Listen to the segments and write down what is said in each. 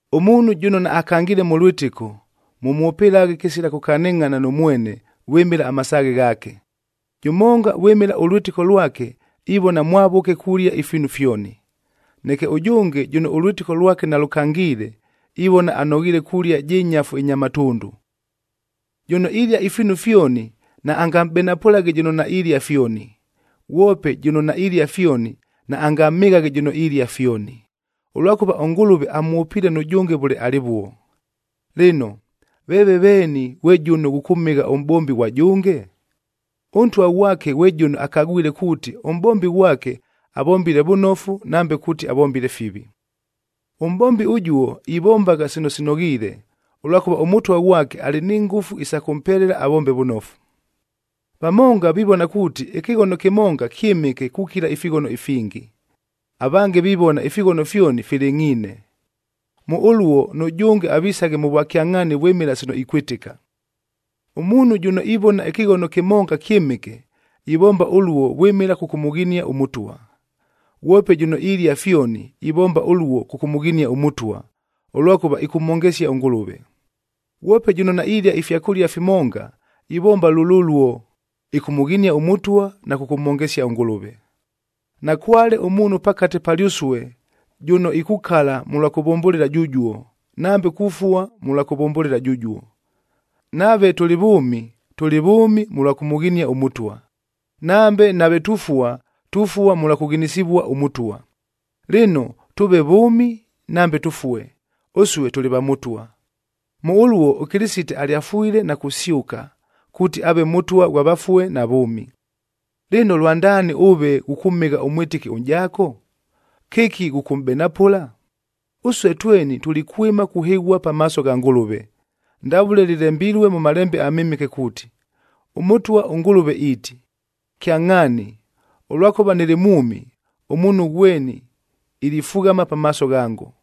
Ʉmuunhu jʉno naakangiile mʉ lwɨtɨko, mʉmwʉpɨlaghe kɨsila kʉkanɨngʼhana nʉ mwene vwɨmɨla amasaaghe ghaake. Jʉmonga vwɨmɨla ʉlwɨtɨko lwake ivona mwavʉke kulia ifiinu fyoni, neke ʉjʉnge jʉno ʉlwɨtɨko lwake nalʉkangiile, ivona anoghiile kulia jɨ nyafu ɨnya matʉndʉ. Jʉno ilia ifiinu fyoni naangamʼbenapʉlaghe jʉno nailia fyoni, ghwope jʉno nailia fyoni naangamhɨghaghe jʉno ilia fyoni, ʉlwakʉva ʉNgʉlʉve amwʉpiile nʉjʉnge vʉle alɨvuo. Lɨno, veeve veeni ghwe jʉno ghʉkʉmhɨgha ʉmʼbombi ghwa jʉnge? Ʉntwa ghwake ghwe jʉno akagwile kuuti, ʉmʼbombi ghwake avombile vʉnofu nambe kuuti avombile fivi. Ʉmʼbombi ʉjuo ivombagha sino sinoghiile, ʉlwakʉva ʉMʉtwa ghwake alɨ ni ngʉfu isa kʉmpelela avombe vʉnofu. Vamonga vivona kuuti, ɨkɨghono kɨmonga kyɨmɨke kukila ifighono ifingi, avange vivona ifighono fyoni filɨngʼhiine. Mʉ ʉluo nʉjʉnge avisaghe mʉ vwakyangʼhaani vwɨmɨla sino ikwɨtɨka. Ʉmuunhu jʉno ivona ɨkɨghono kɨmonga kyɨmɨke, ivomba ʉluo vwɨmɨla kʉkʉmʉghinia ʉMʉtwa. Ghwope jʉno ilia fyoni, ivomba ʉluo kʉkʉmʉghinia ʉMʉtwa, ʉlwakʉva ɨkʉmhongesia ʉNgʉlʉve. Ghwope jʉno nailia ifyakʉlia fimonga, ivomba lʉlʉluo, ɨkʉmʉghinia ʉMʉtwa na kʉkʉmhongesia ʉNgʉlʉve. Nakwale ʉmuunhu pakate palyʉsue jʉno ikukala mʉlwa kuvʉmbʉlɨla jʉjuo, nambe kufua mʉlwa kuvʉmbʉlɨla jʉjuo. Nave tʉlɨ vʉʉmi, tʉlɨ vʉʉmi mʉlwa kʉmʉghinia ʉMʉtwa; nambe nave tufua, tufua mʉlwa kʉghinisivua ʉMʉtwa. Lɨno, tʉʉve vʉʉmi nambe tʉfue, ʉsue tʉlɨ va Mʉtwa. Mʉ ʉluo ʉKɨlɨsite alyafwile na kusyʉka, kuuti aave Mʉtwa ghwa vafue na vʉʉmi. Lɨno, lwandaani ʉve ghʉkʉmhɨgha ʉmwɨtɨki ʉnʼjaako? Kɨki ghʉkʉmʼbenapʉla? Ʉsue tweni tulikwɨma kuhɨghua pamaaso gha Ngʉlʉve. Ndavʉle lɨlembilue mʉ Malembe aMɨmɨke kuuti, “ɄMʉtwa ʉNgʉlʉve iiti, ‘Kyangʼhaani, ʉlwakʉva nɨlɨ mwʉmi, ʉmuunhu ghweni ilifughama pamaaso ghango,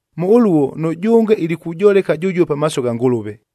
Mʉ ʉluo nʉjʉnge ilikujoleka jʉjuo pamaaso gha Ngʉlʉve.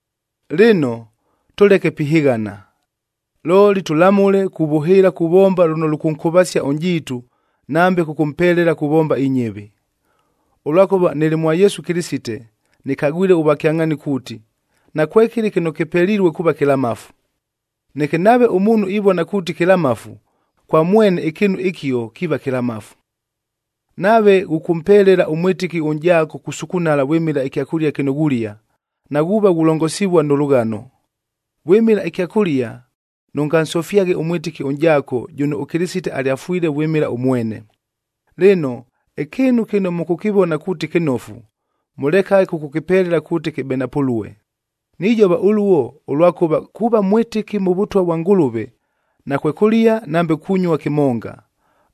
Lɨno, tʉleke pihɨghana, looli tʉlamʉle kuvʉhɨɨla kuvomba lʉno lʉkʉnkʉvasia ʉnʼjiitu nambe kʉkʉmpelela kuvomba inyɨvi. Ʉlwakʉva nɨlɨ mwa Yesu Kɨlɨsite nɨkagwile ʉvwakyangʼhaani kuuti, nakwekɨlɨ kɨno kɨpelilue kuuva kɨlamafu. Neke nave ʉmuunhu ivona kuuti kɨlamafu, kwa mwene ɨkɨɨnu ɨkio kiiva kɨlamafu. Nave ghʉkʉmpelela ʉmwɨtɨki ʉnʼjaako kusukunala vwɨmɨla ɨkyakʉlia kɨno ghulia, naghuuva ghulongosivua nʉ lʉghano. Vwɨmɨla ɨkyakʉlia, nʉngansofyaghe ʉmwɨtɨki ʉnʼjaako jʉno ʉKɨlɨsite alyafwile vwɨmɨla ʉmwene. Lɨno, ɨkɨɨnu kɨno mʉkʉkɨvona kuuti kɨnofu, mʉlekaghe kʉkʉkɨpelela kuuti kɨbenapʉlue. Nijova ʉluo, ʉlwakʉva kuuva mwɨtɨki mʉ Vʉtwa vwa Ngʉlʉve nakwekʉlia nambe kunyua kɨmonga,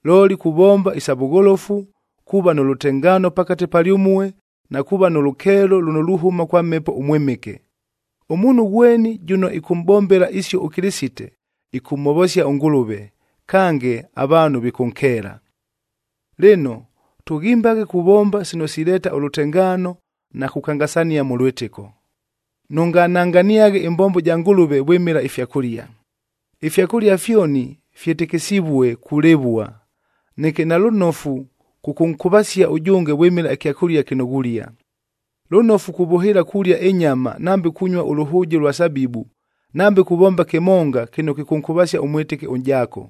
looli kuvomba isa vʉgholofu, kuuva nʉ lʉtengaano pakate palyʉmue, na kuuva nʉ lʉkeelo lʉno luhʉma kwa Mhepo ʉMwɨmɨke. Ʉmuunhu ghweni jʉno ɨkʉmʼbombela isio ʉKɨlɨsite, ɨkʉmhovosia ʉNgʉlʉve, kange avaanhu vikʉnkeela. Lɨno, tʉghimbaghe kuvomba sino sileeta ʉlʉtengaano na kukangasania mʉ lwɨtɨko. Nʉngananganiaghe ɨmbombo ja Ngʉlʉve vwɨmɨla ifyakʉlia. Ifyakʉlia fyoni fyɨtɨkɨsivue kulɨvua, neke nalʉnofu kʉkʉnkʉvasia ʉjʉnge vwɨmɨla ɨkyakʉlia kɨno ghulia. Lʉnofu kuvʉhɨɨla kulia ɨnyama nambe kunyua ʉlʉhʉʉje ʉlwa sabibub nambe kuvomba kɨmonga kɨno kɨkʉnkʉvasia ʉmwɨtɨki ʉnʼjaako.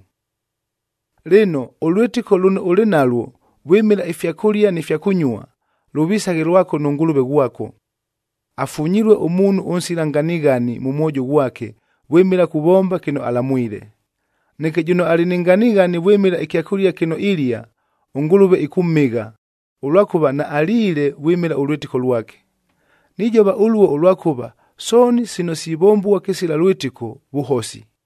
Lɨno, ʉlwɨtɨko lʉno ʉlɨ nalwo vwɨmɨla ifyakʉlia ni fya kʉnyua, lʉvisaghe lwako nʉ Ngʉlʉve ghwako. Afunyilue ʉmuunhu ʉnsila nganighani mʉ mwojo ghwake vwɨmɨla kuvomba kɨno alamwile. Neke jʉno alɨ ni nganighani vwɨmɨla ɨkyakʉlia kɨno ilia, ʉNgʉlʉve ɨkʉmhɨgha, ʉlwakʉva naaliile vwɨmɨla ʉlwɨtɨko lwake. Nijova ʉluo ʉlwakʉva sooni sino sivombua kɨsila lwɨtɨko, vʉhosi.